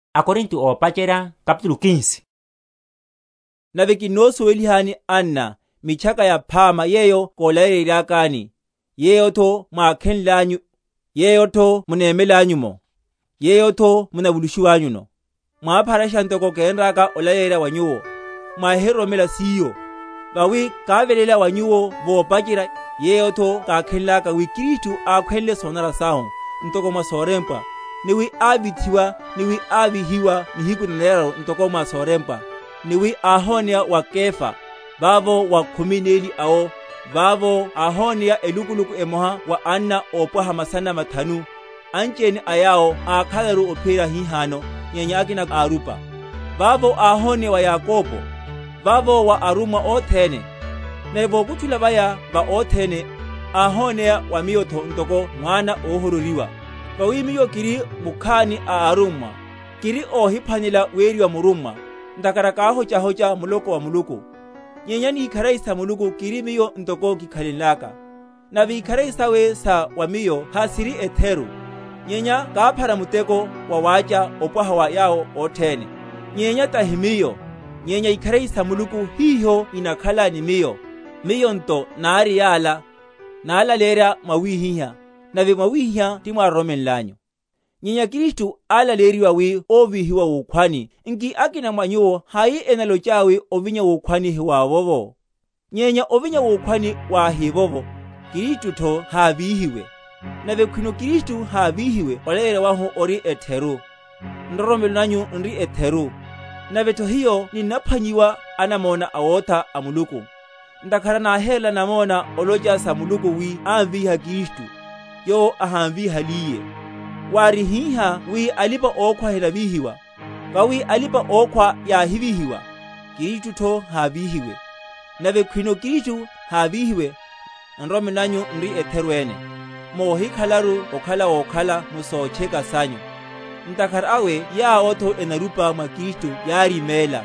Sa ovinyatho. Nave kinnosuwelihani, anna, Mitchaka Yaphama yeyo kólaleyenryakani, yeyotho mwákhenlanyu, yeyotho munemelanyu’mo, yeyotho munavulushiwanyuno; mwápharasha ntoko kénraka olaleyerya wa nyuwo; mwáhiroromenle siyo. Vawi káveléla wa nyuwo vopacherya, yeyotho kákhenlaka, wi Kristu ákhwenle sonanara sahu, ntoko mwa sorempwa; ni wi ávithiwa; ni wi ávíhiwa nihiku naneraru, ntoko mwa sorempwa; ni wi áhoneya wa Kefa; vavo wa khumi neli awo; vavo áhoneya elukuluku emoha wa anna ópwaha masana mathanu, anchiene a yawo ákhalaru ophiyerya hihano, nyenya akina árupa; vavo áhoneya wa Yakobo; vavo wa arummwa othene; nave vokutchulela vaya va othene, áhoneya wa miyotho ntoko mwana óhororiwa. Vawi miyo kiri mukhani a arummwa, kiri óhiphwanelela weriwa murummwa, ntakhara káhochahocha muloko wa Muluku. Nyenya ni ikharari sa Muluku kiri miyo ntoko kikhalenlaka; nave ikharari sawe sa wa miyo hasiri etheru, nyenya káphara muteko wawácha opwaha wa yawo othene; nyenya tahi miyo, nyenya ikharari sa Muluku hiho inakhala ni miyo. Miyo nto, nari yala, nalaleyerya mwawihihá, nave mwawihihá timwároromenlanyu. Nyenya Kristu álaleyeryiwa wi óvíhiwa wukhwani, nki akina mwa nyuwo hai enalochaya wi ovinya wukhwani hiwavovo? Nyenya ovinya wukhwani wahivovo, Kristutho hávíhiwe; nave khwino Kristu hávíhiwe olaleyerya wahu ori etheru, nroromelo nanyutho n’ri etheru. Navetho hiyo n’naphwanyiwa anamona awotha a Muluku; ntakhara náhérela namona olocha sa Muluku wi ámvíha Kristu; yowo ahámvíhaliye, wári hihá wi alipa‐okhwa henavíhiwa. Vawi alipa‐okhwa yáhivíhiwa, Kristutho hávíhiwa; nave khwino Kristu hávíhiwe, nroromelo nanyu n’ri etheru ene; mohikhalelaru okhala wokhala m’sotcheka sanyu. Ntakhara awe yawotho enarupa mwa Kristu yáriméla.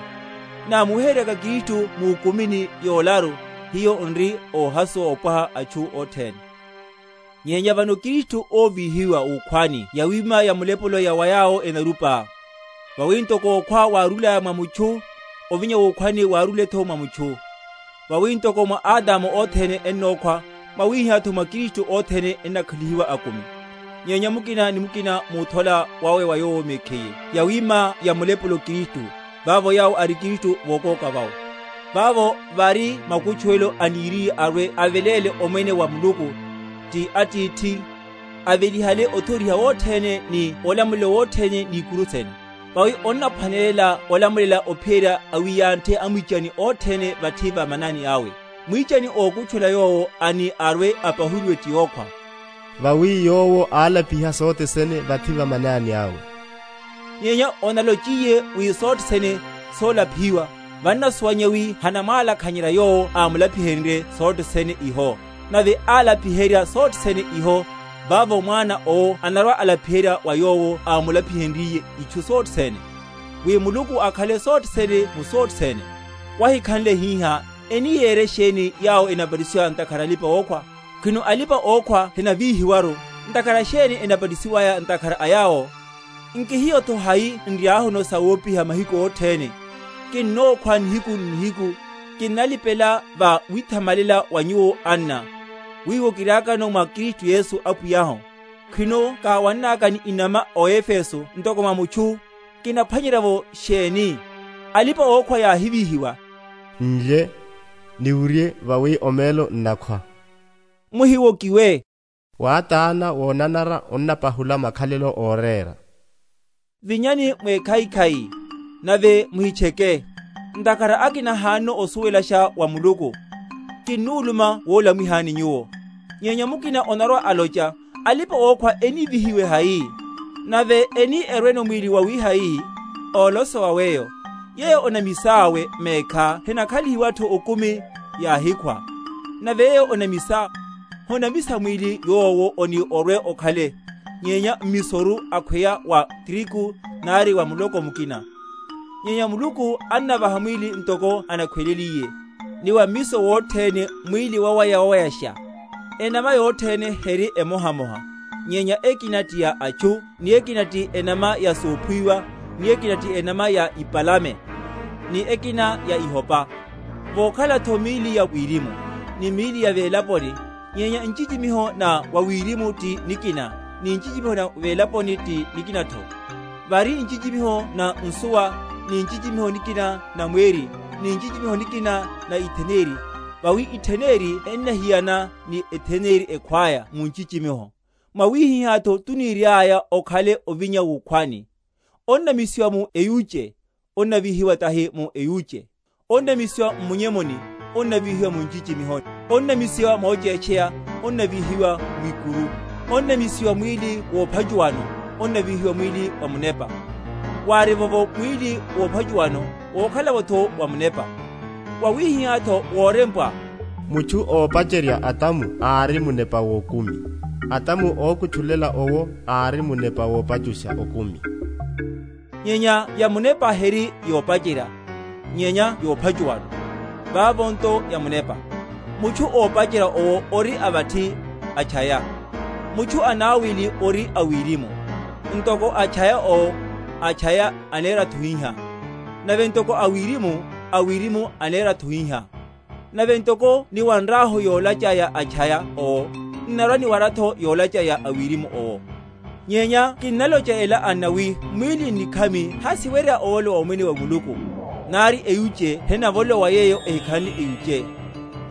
Namuweheryeryaka Kristu mukumini yolaru, hiyo n’ri óhasuwa ópwaha a atchu othene. Nyenya vano Kristu óvíhiwa wukhwani yawima yamulepulo ya yawo enarupa. Vawi ntoko okhwa wárúlaya mwa mutchu, ovinya wukhwani wárúletho mwa mutchu. Vawi ntoko mwa Adamu othene ennokhwa, mwawihihátho mwa Kristu othene ennakhalihiwa akumi. Nyenya mukina ni mukina múthola wawe wa yowo mekhiye; yawima yamulepulo Kristu; vavo yawo a Kristu, vokóka vawe. Vavo vari makutchuwelo, aniriye arwe‐aveléle omwene wa Muluku, ti Atithi, avelihale othoriha wothene, ni olamulelo wothene, ni ikuru sene. Vawi onnaphwanelela olamulela ophiyerya awiyanthe amwichani othene vathi va manani awe. Mwichani ókutchulela yowo ani arwe‐apahuliwe ti okhwa. Vawi yowo álapiha sothe sene vathi va manani awe. Nyenya onalochiye wi sothe sene solapihiwa, vannasuwanyeya wi hanamwalakhanyerya yowo ámulapihenrye sothe sene iho. Nave alapiheryiwe sothe sene iho, vavo Mwana owo anarwa‐alapiheryiwa wa Yowo ámulapihenrye itchu sothe sene, wi Muluku akhale sothe sene mu sothe sene. Wahikhanle hihá, eni yere sheni yawo enabatisiwa ntakhara a alipa‐okhwa? Khwino alipa‐okhwa henavíhiwaru, ntakhara sheni enabatisiwaya ntakhara a yawo? Nki hiyotho hai n’riahu m’sawopiha mahiku othene? Kinnokhwa nihiku n’nihiku, kinnalipela va withamalela wa nyuwo, anna, wiwo kiriakano mwa Kristu Yesu, Apwiyahu. Khwino káwannaka ni inama o Efeso ntoko mwa mutchu, kinaphwanyerya’vo sheni? Alipa‐okhwa yáhivíhiwa, n’lye, niwurye vawi omelo n’nakhwa. Muhiwokiwe; wátána wonanara onnapa?-?hula makhalelo órera. Vinyani mwekhaikhai, nave muhitcheke; ntakhara akina hanono osuwelasha wa Muluku. Kinuluma wolamwihani nyuwo. Nyenya mukina onarwa‐alocha, Alipa‐okhwa enívíhiwe hai? Nave eni erweno mwíli wawihai? Ólosowa weyo, yeyo onamisá mekhá henakhalihiwatho okumi, yáhikhwa; nave yeyo onamisá, honamisa mwíli yowo oni orwe‐okhale, nyenya mmisoru akhweya wa trigu, nari wa muloko mukina; nyenya Muluku annavaha mwíli ntoko anakhweleliye; ni wa mmiso wothene mwíli wawaya‐wayasha. Enama yothene heri emohamoha; nyenya ekina ti ya atchu, ni ekina ti enama ya sophuwiwa, ni ekina ti enama ya ipalame, ni ekina ya ihopa. Vokhalatho míli ya wirimu, ni míli ya velaponi: nyenya nchichimiho na wawirimu ti nikina, ni nchichimiho na welaponi ti nikinatho. Vari nchichimiho na nsuwa, ni nchichimiho nikina na mweri, ni nchichimiho nikina na itheneri; vawi etheneri ennahiyana ni etheneri ekhwaya mu nchichimiho. Mwawihihátho tuniriaya okhalele ovinya wukhwani. Onnamisiwa mu eyuche, onnavíhiwa tahi mu eyuche; onnamisiwa m’munyemu, onnavíhiwa mu nchichimiho; onnamisiwa mochétcheya, onnavíhiwa mwikuru; onnamisiwa mwíli wophachuwano, onnavíhiwa mwíli wa munepa. Wárivovo mwíli wophachuwano, wokhalatho wa munepa. Wawihihátho worempwa, Mutchu ópacherya Adamu ári munepa wokumi. Adamu ókutchulela owo ári munepa wopachusha okumi. Nyenya yamunepa heri yopacherya, nyenya yophachuwano; vavo nto yamunepa. Mutchu ópacherya owo ori a vathi, a’tchaya. Mutchu anawili ori a wirimu. Ntoko a’tchaya owo, a’tchaya aneratho hihá; nave ntoko a wirimu, a wirimu aneratho hihá. Nave ntoko niwanrahu yolacha ya a’tchaya owo, n’narwa‐niwaratho yolacháya ya a wirimu owo. Nyenya kinnalocha ela, anna, wi mwíli n’nikhami hasiwerya ovolowa Omwene wa Muluku; nari eyuche henavolowa yeyo ehikhanle eyuche.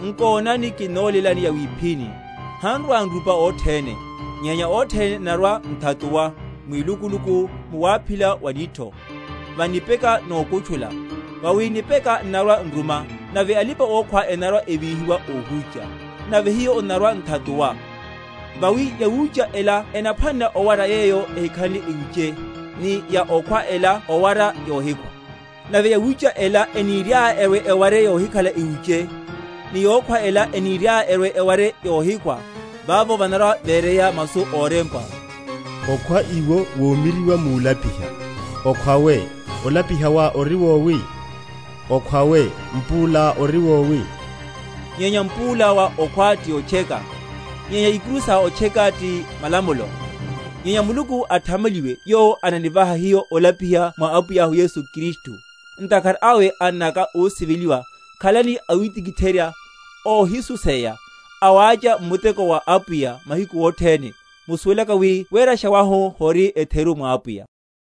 Nkonani, kinnolélani yawiphíni; han’rwa‐nrupa othene, nyenya othene n’narwa‐nthatuwa, Mwilukuluku, mu waphila wa nitho, va nipeka nokutchulela; vawi nipeka n’narwa‐nruma, nave alipa‐okhwa enarwa‐evíhiwa óhúcha, nave hiyo n’narwa‐nthatuwa. Vawi yawucha ela ennaphwanela owara yeyo ehikhanle eyuche, ni ya okhwa ela owara yohikhwa. Nave yawucha ela eniriaya erwe‐eware yohikhala eyuche, ni yokhwa ela eniriaya erwe‐eware yohikhwa, vavo vanarwa‐vereya masu órempwa, Okhwa iwo womiryiwa mulapiha. Okhwa we, olapiha wá ori wowi? Okhwa we, mpúlá ori wowi? Nyenya mpúla wa okhwa ti otcheka; nyenya ikuru sa otcheka ti malamulo: nyenya Muluku athamaliwe, yowo ananivaha hiyo olapiha mwa Apwiyahu Yesu Kristu. Ntakhara awe, annaka ósiveliwa, khalani awitikitherya, óhisuseya, awácha m’mutekoni wa Apwiya, mahiku othene, musuwelaka wi werasha wanyu hori etheru mwa Apwiya.